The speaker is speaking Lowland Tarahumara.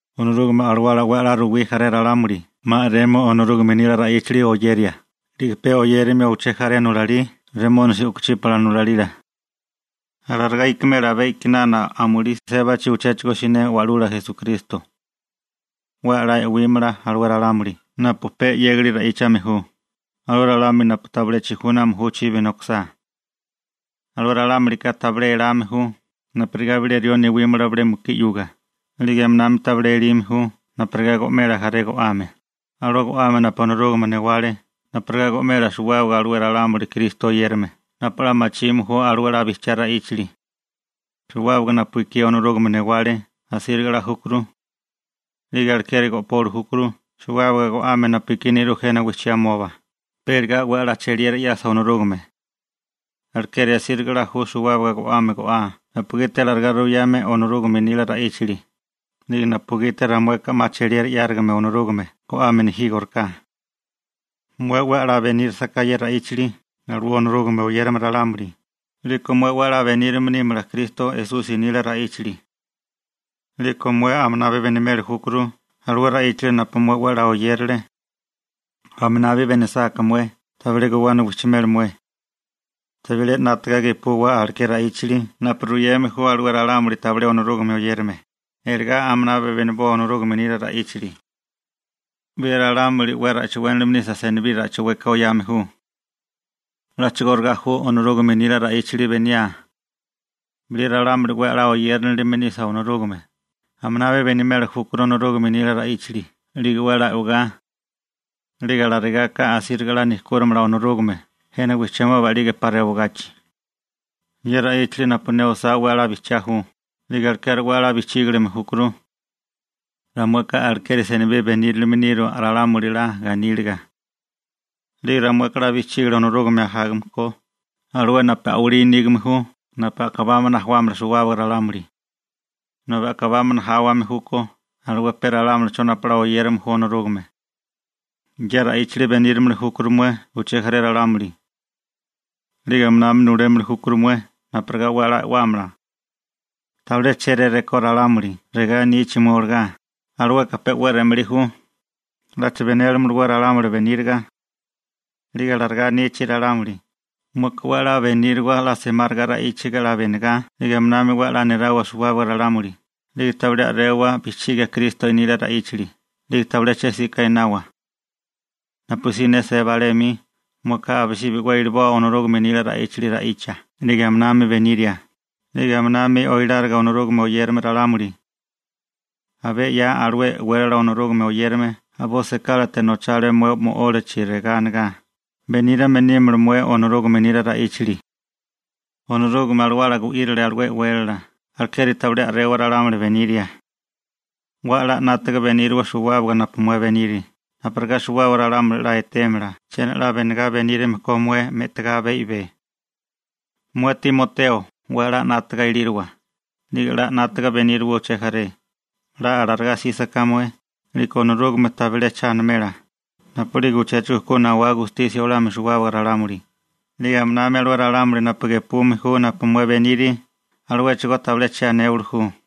Onorúgame Alawala 'we 'la ruwí jaré ralámuli 'ma a'remio Onorúgame nila ra'íchali oyeria, 'lige pe oyérimio uché jaré nulalí remónisi u'kuchípala nulalila. Alarigá ikimela abé a'kinana amulí sébachi uchéchigo siné Wa'lula Esukristo. 'We 'la e'wímala alué ralámuli napu pe 'yégali ra'íchame ju, alué ralámuli napu tabilé chijúname ju chibi nokisá. Alué ralámulika tabilé elame ju napurigá bilé rió newímala bilé mukí 'yuga 'lige aminami tabilé elime ju napurigá go'mela jaré go'ame, alué go'ame napu Onorúgame newale napurigá go'mela suwábaga alué ralámuli Kristo oyérame napu 'la machime ju alué 'la bijchiá ra'íchali. Suwábaga napu ekí Onorúgame newale asíriga 'la júkuru. 'Lige alekeri go'poli júkuru suwábaga go'ame napu ekí nerú jena wijchimoba, pe iligá 'we 'la cheliera 'yasa Onorúgame. Alekeri asíriga 'la ju suwábaga go'ame go'aa napugiti alarigá ruyame alué Onorúgame nila ra'íchali, 'lige napugiti ramueka 'ma cheliera 'yárigame Onorúgame go'ame nejígoriká. Mué 'we 'la benírisaká ye ra'íchali alué Onorúgame oyérame ralámuli, 'liko mué 'we 'la benírame nímala Kristo Esusi nila ra'íchali. 'Liko mué aminabi benimeli júkuru alué ra'íchali napu mué 'we 'la oyérale. Aminabi benisáká mué, tabilé guwana wijchimela mué. Tabilé 'nátaga gepuwa aleké ra'íchali napu ruyeme ju alué ralámuli tabilé Onorúgame oyérame, iligá aminabi beniboa Onorúgame nila ra'íchali. Bilé ralámuli 'we ra'chiwénilime nisa senibí ra'chueka oyame ju. A'chigóriga ju Onorúgame nila ra'íchali beniaa. Bilé ralámuli 'we a'lá oyérinilime nisa Onorúgame, aminabi benimeli júkuru Onorúgame nila ra'íchali 'lige 'we 'la e'wagá. 'Lige alarigaka asíriga 'la nejkúrimala Onorúgame jena wijchimoba 'lige 'pa rewagachi. Ye ra'íchali napu ne osá 'we 'la bijchiá ju, 'lige alekeri 'we 'la bijchígilime júkuru. Ramueka alekeri senibí benírame niru ralámuli 'la ganíliga. 'Lige ramueka 'la bijchígilia Onorúgame ajágame ko, alué napu a'walí nígame ju napu a'kabámana ajuámala suwábaga ralámuli. Nobi a'kabámana jáwame júkó alué pe ralámulicho napu 'we 'la oyérame ju Onorúgame. Ye ra'íchali benírimili júkuru mué uché jaré ralámuli. 'Lige aminami nulémili júkuru mué napurigá 'we 'la e'wámala. Tabilé chéré rekó ralámuli regá anichi mué olagá: «Alueka pe 'we re'malí ju, ¿'lacha benélamalawé ralámuli beníriga?» 'Lige alarigá anichi ralámuli, mueka 'we 'la beníriwa 'la semáriga ra'íchiga 'la benigá 'lige aminami 'we 'la nirawa suwábaga ralámuli, 'lige tabilé a'rewa bijchigia Kristo nila ra'íchali, 'lige tabilé che 'sika einawa. Napusí ne seba alé 'mi, mueka abisibi 'we iliboa Onorúgame nila ra'íchali ra'icha 'lige aminami beniria, 'lige aminami oiláriga Onorúgame oyérame ralámuli. Abé 'ya, alué e'wélala Onorúgame oyérame a'boi sekálate nochale mué mo'ólachi regá anigá: «Beníriame nímala mué Onorúgame nila ra'íchali.» Onorúgame Alawala gu'írile alué e'wélala, alekeri tabilé a'rewa ralámuli beniria. 'We 'la 'nátaga beníriwa suwábaga napu mué beniri, napurigá suwábaga ralámuli 'la etémala chiena 'la benegá benírime ko mué me'tigá abé i'bé. Mué Timoteo, 'we 'la 'nátaga ilíriwa, 'lige 'la 'nátaga beníriwa uché jaré, 'la alarigá 'sísaká mué, 'liko Onorúgame tabilé cha animela napu'lige uchéchigo ku nawá gatemia (gustisia olamia) suwábaga ralámuli 'yuga, 'lige aminami alué ralámuli napu gepume ju napu mué beniri, aluéchigó tabilé che anéwali ju.